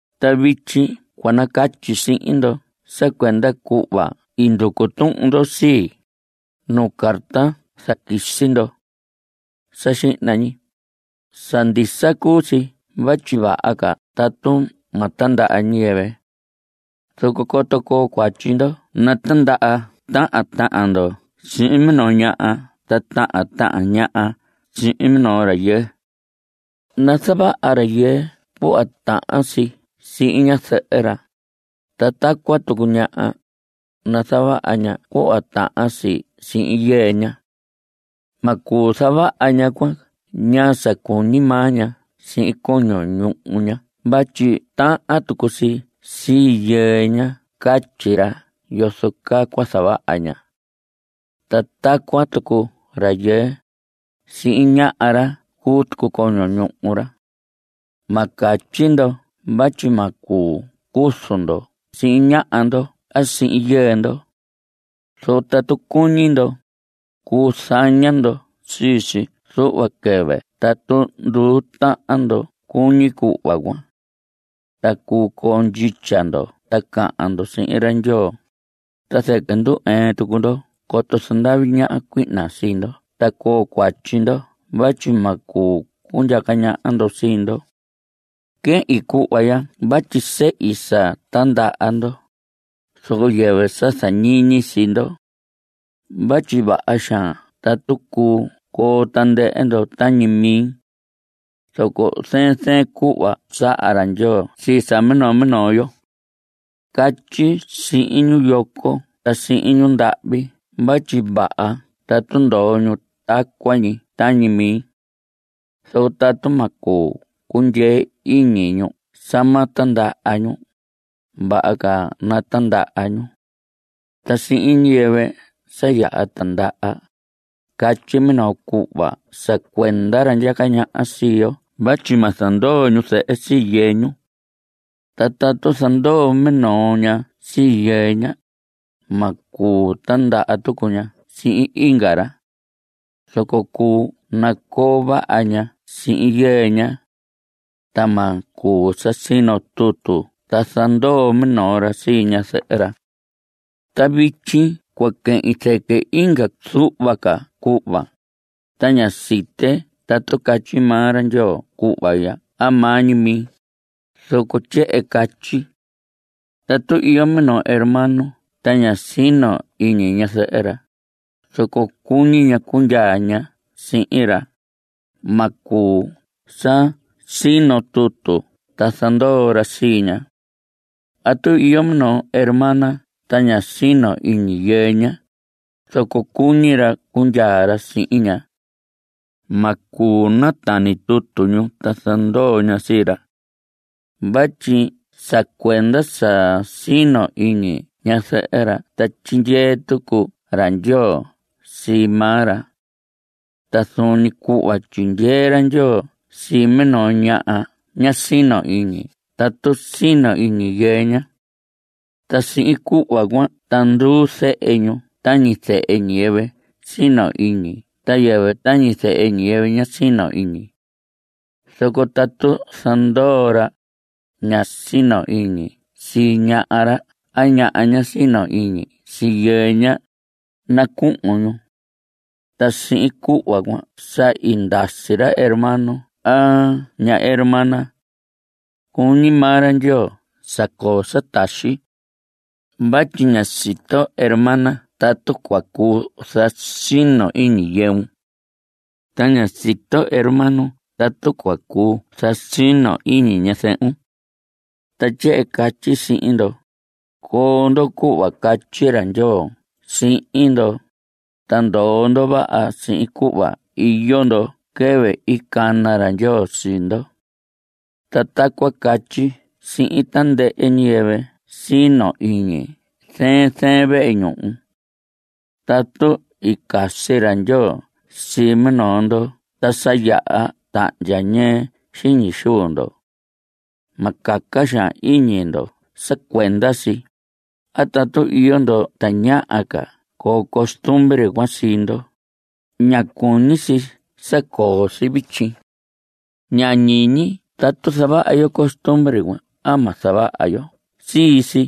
Ta vityi cua nacatyi sihin ndo sa cuenda cuhva i nducu tuhun ndo sii, nuu carta i zaquisi ndo. Sa xihna ñi, sa ndisa cuu si vatyi vaha ca tatu ma tindaha ñiyɨvɨ. Zoco coto coo cuatyi ndo natindaha tahan tahan ndo sihin minoo ñaha ta tahan tahan ñaha sihin minoo rayɨɨ. Nazavaha rayɨɨ cuhva tahan si sihin ñazɨhɨ ra. Ta tacuan tucu ñaha, nazavaha ña cuhva tahan si sihin yɨɨ ña. Ma cuu zavaha ñaha cuan ñaa sa cuñi maa ña sihin coño ñuhu ña vatyi tahan tucu si sii yɨɨ ña catyi ra yozo caa cua zavaha ña. Ta tacuan tucu rayɨɨ, sii ñaha ra cuu tucu coño ñuhu ra. Ma catyi ndo vatyi ma cuu cuzu ndo sihin ñaha ndo a sihin yɨɨ ndo. Zoco tatu cuñi ndo, cuu zaña ndo sii si zuhva quɨvɨ tatu nduu tahan ndo cuñi cuhva cuan. Ta cuu coo ndyitya ndo ta cahan ndo sihin ra Ndyoo. Ta zɨquɨ ndu‑ɨɨn tucu ndo coto zandavi ñaha cuihna sii ndo ta coo cuatyi ndo vatyi ma cuu cundyaca ñaha ndo sii ndo. Quehin cuhva ya vatyi sehi sa tindaha ndo, zoco yɨvɨ sa zañiñi sii ndo. Vatyi vaha xaan tatu cuu coo tandɨhɨ ndo tañi mi. Zoco zɨɨn zɨɨn cuhva saha ra Ndyoo sii sa minoo minoo yo. Catyi sihin ñu yoco ta sihin ñundahvi vatyi vaha tatu ndoo ñu tacuan ñi tañi mi. Zoco tatu ma cuu cundyee iñi ñu sa ma tindaha ñu, vaha ca natindaha ñu. Ta sihin ñiyɨvɨ sa yaha tindaha, catyi minoo cuhva sa cuenda ra ndyaca ñaha sii yo vatyi ma zandoo ñuzɨhɨ sii yɨɨ ñu. Ta tatu zandoo minoo ña sii yɨɨ ña, ma cuu tindaha tucu ña sihin inga ra. Zoco cuu nacoo vaha ña sihin yɨɨ ña. Ta ma cuu sa sino tutu ta zandoo minoo ra sii ñazɨhɨ ra. Ta vityi cua quehin zɨquɨ inga zuhva ca cuhva, ta ña site tatu catyi maa ra Ndyoo cuhva ya a maa ñi mi, zoco tyehen catyi. Tatu iyo minoo hermano ta ña sino iñi ñazɨhɨ ra, zoco cuñi ña cundyaa ña sihin ra, ma cuu sa sino tutu ta zandoo ra sii ña. A tatu iyo minoo hermana ta ña sino iñi yɨɨ ña, zoco cuñi ra cundyaa ra sihin ña. Ma cuu natani tutu ñu ta zandoo ña sii ra. Vatyi sa cuenda sa sino iñi ñazɨhɨ ra ta tyindyee tucu ra Ndyoo sii maa ra. Ta zuun ñi cuhva tyindyee ra Ndyoo sii minoo ñaha ña sino iñi tatu sino iñi yɨɨ ña. Ta sihin cuhva cuan ta nduu zehe ñu tañi zehe ñiyɨvɨ sino iñi ta yɨvɨ tañi zehe ñiyɨvɨ ña sino iñi. Zoco tatu zandoo, ra ña sino iñi sii ñaha ra a ñaha ña sino iñi sii yɨɨ ña, nacuhun ñu. Ta sihin cuhva cuan sa i ndasi ra hermano a ña hermana. Cuñi maa ra Ndyoo sa coo sa taxi. Vatyi ña siton hermana tatu cua cuu zasinon iñi yɨun. Ta ña siton hermano tatu cua cuu zasinon iñi ñazɨhun. Ta tyehen catyi sihin ndo: Coo ndo cuhva catyi ra Ndyoo sihin ndo. Ta ndoo ndo vaha sihin cuhva iyo ndo quɨvɨ i cana ra Ndyoo sii ndo. Ta tacuan catyi sihin tandɨhɨ ñiyɨvɨ sino iñi zɨɨn zɨɨn vehe ñuhu. Tatu i casi ra Ndyoo sii minoo ndo ta sa yaha tahndya ñɨɨ xiñi xuu ndo. Ma caca xaan iñi ndo sa cuenda si. A tatu iyo ndo tañaha ca coo costumbre cuan sii ndo, ña cuñi si sa coo si vityi. Ña ñiñi tatu zavaha yo costumbre cuan a ma zavaha yo sii si.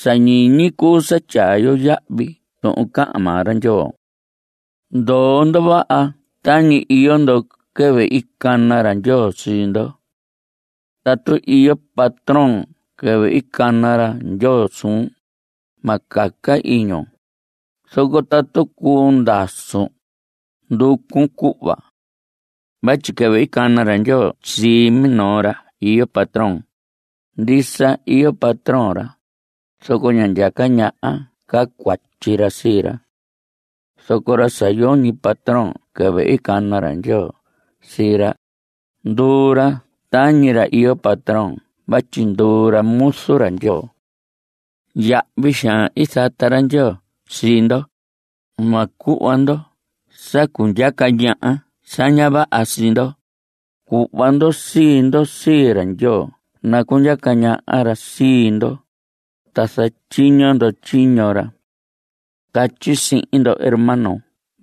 Sa ñiñi cuu sa tyaa yo yahvi tuhun cahan maa ra Ndyoo. Ndoo ndo vaha tañi iyo ndo quɨvɨ i cana ra Ndyoo sii ndo. Tatu iyo patrón quɨvɨ i cana ra Ndyoo suun, ma caca iñun. Zoco tatu cuu ndasun, nducun cuhva. Vatyi quɨvɨ i cana ra Ndyoo sii minoo ra iyo patrón, ndisa iyo patrón ra, zoco ña ndyaca ñaha ca cuatyi ra sii ra. Zoco ra sa yoñi patrón quɨvɨ i cana ra Ndyoo sii ra, nduu ra tañi ra iyo patrón vatyi nduu ra muzu ra Ndyoo. Yahvi xaan i zata ra Ndyoo sii ndo. Ma cuhva ndo sa cundyaca ñaha sa ña vaha sii ndo. (Cuhva ndo sii ndo sii ra Ndyoo nacundyaca ñaha ra sii ndo, ta zatyiño ndo tyiño ra.) Catyi sihin ndo hermano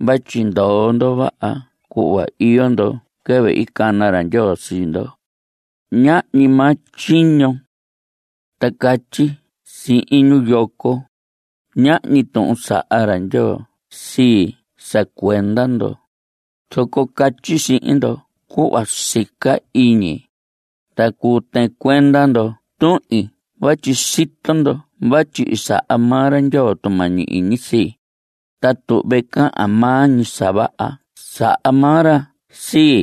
vatyi ndoo ndo vaha cuhva iyo ndo quɨvɨ i cana ra Ndyoo sii ndo, ñaa ñi maa tyiño. Ta catyi sihin ñu yoco, ñahñi tuhun i saha ra Ndyoo sii sa cuenda ndo, zoco catyi sihin ndo cuhva sica iñi, ta cuu tɨɨn cuenda ndo tuhin vatyi sito ndo vatyi i saha maa ra Ndyoo tumañi iñi sii, ta tuhve cahan maa ñi sa vaha sa saha maa ra sii.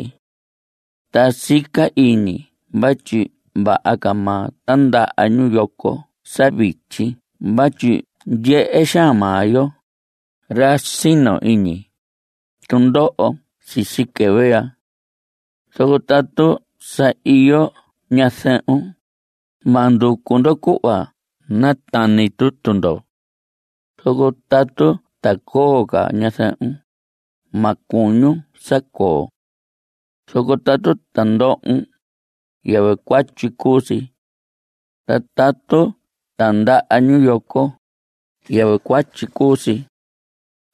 Ta sica iñi vatyi vaha ca ma tindaha ñu yoco sa vityi vatyi ndyehe xaan maa yo, ra sino iñi, tundoho sisi quɨvɨ ya. Zoco tatu sa iyo ñazɨhun, ma nducu ndo cuhva natani tutu ndo. Zoco tatu ta coo ca ñazɨhun, ma cuñun sa coo. Zoco tatu tindohon, yɨvɨ cuatyi cuu si. Ta tatu tindaha ñu yoco, yɨvɨ cuatyi cuu si.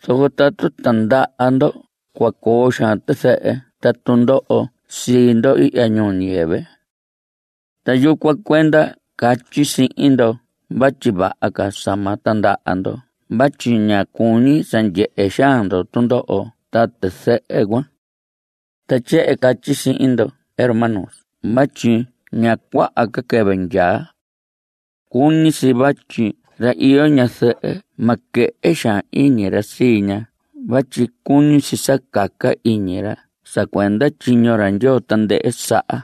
Zoco tatu tindaha ndo cua coo xaan tizɨhɨ ta tundoho sii ndo ihya ñuu ñiyɨvɨ. Ta yucuan cuenda catyi sihin ndo vatyi vaha ca sa ma tindaha ndo vatyi ña cuñi sa ndyehe xaan ndo tundoho ta tizɨhɨ cuan. Ta tyehen catyi sihin ndo hermanos vatyi ña cuaha ca quɨvɨ ndyaa. Cuñi si vatyi ra iyo ñazɨhɨ ma quɨhɨ xaan iñi ra sii ña vatyi cuñi si sa caca iñi ra sa cuenda tyiño ra Ndyoo tandɨhɨ saha.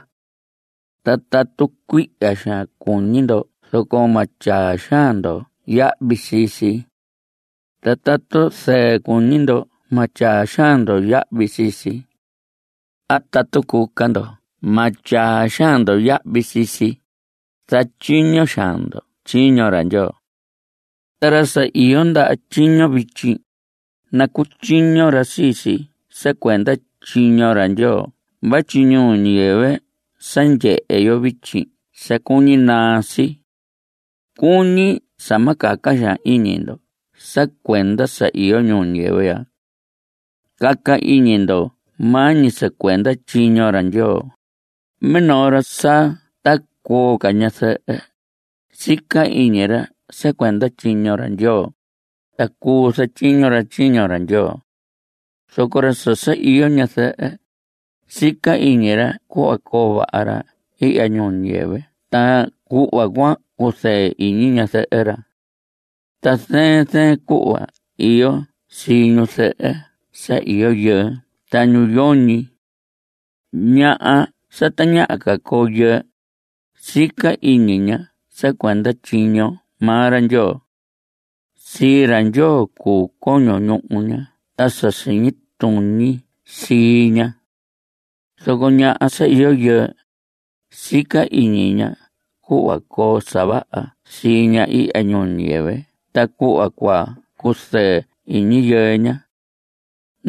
Ta tatu cuihya xaan cuñi ndo zoco ma tyaa xaan ndo yahvi sii si. Ta tatu zɨɨ cuñi ndo ma tyaa xaan ndo yahvi sii si. A tatu cuca ndo ma tyaa xaan ndo yahvi sii si, zatyiño xaan ndo tyiño ra Ndyoo. Ta ra sa iyo ndaha tyiño vityi, nacutyiño ra sii si sa cuenda tyiño ra Ndyoo vatyi ñuu ñiyɨvɨ sa ndyehe yo vityi sa cuñi naa si. Cuñi sa ma caca xaan iñi ndo sa cuenda sa iyo ñuu ñiyɨvɨ ya. Caca iñi ndo maa ñi sa cuenda tyiño ra Ndyoo. Minoo ra sa ta coo ca ñazɨhɨ, sica iñi ra sa cuenda tyiño ra Ndyoo, ta cuu zatyiño ra tyiño ra Ndyoo. Zoco ra sa iyo ñazɨhɨ, sica iñi ra cuhva coo vaha ra ihya ñuu ñiyɨvɨ ta cuhva cua cuzɨɨ iñi ñazɨhɨ ra. Ta zɨɨn zɨɨn cuhva iyo sii ñuzɨhɨ sa iyo yɨɨ ta ñu yoñi. Ñaha sa tañaha ca coo yɨɨ, sica iñi ña sa cuenda tyiño maa ra Ndyoo. Sii ra Ndyoo cuu coño ñuhu ña ta sa siñi tuñi sii ña. Zoco ñaha sa iyo yɨɨ, sica iñi ña cuhva coo sa vaha sii ña ihya ñuu ñiyɨvɨ ta cuhva cua cuzɨɨ iñi yɨɨ ña.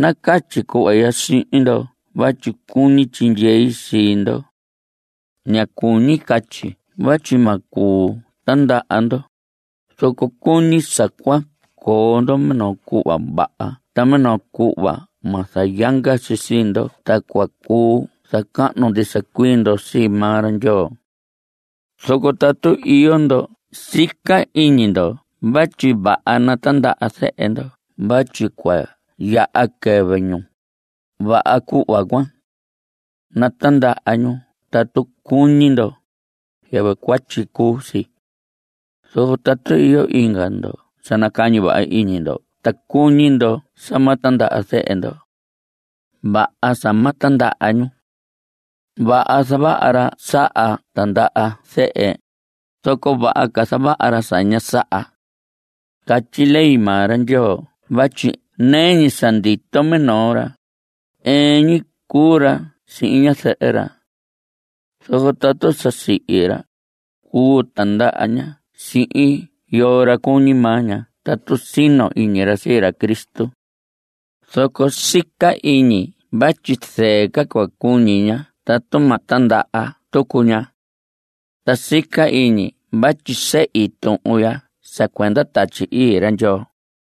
Nacatyi cuhva ya sihin ndo vatyi cuñi tyindyei sii ndo. Ña cuñi catyi vatyi ma cuu tindaha ndo. Zoco cuñi sa cua coo ndo minoo cuhva vaha ta minoo cuhva ma zayanga si sii ndo ta cua cuu zacahnu ndisa cuii ndo sii maa ra Ndyoo. Zoco tatu iyo ndo sica iñi ndo vatyi vaha natindaha zehe ndo vatyi cua yaha quɨvɨ ñu, vaha cuhva cuan. Natindaha ñu tatu cuñi ndo. Yɨvɨ cuatyi cuu si. Zoco tatu iyo inga ndo sa nacañi vaha iñi ndo ta cuñi ndo sa ma tindaha zehe ndo. Vaha sa ma tindaha ñu. Vaha zavaha ra saha tindaha zehe, zoco vaha ca zavaha ra sa ña saha. Catyi ley maa ra Ndyoo vatyi nɨɨ ñi sa ndito minoo ra, ɨɨn ñi cuu ra sihin ñazɨhɨ ra. Zoco tatu sa sihi ra, cuu tindaha ña sihin yoo ra cuñi ña tatu sino iñi ra sii ra Cristo. Zoco sica iñi vatyi zɨɨ ca cua cuñi ña tatu ma tindaha tucu ña. Ta sica iñi vatyi sehi tuhun ya sa cuenda Tatyi Ii ra Ndyoo.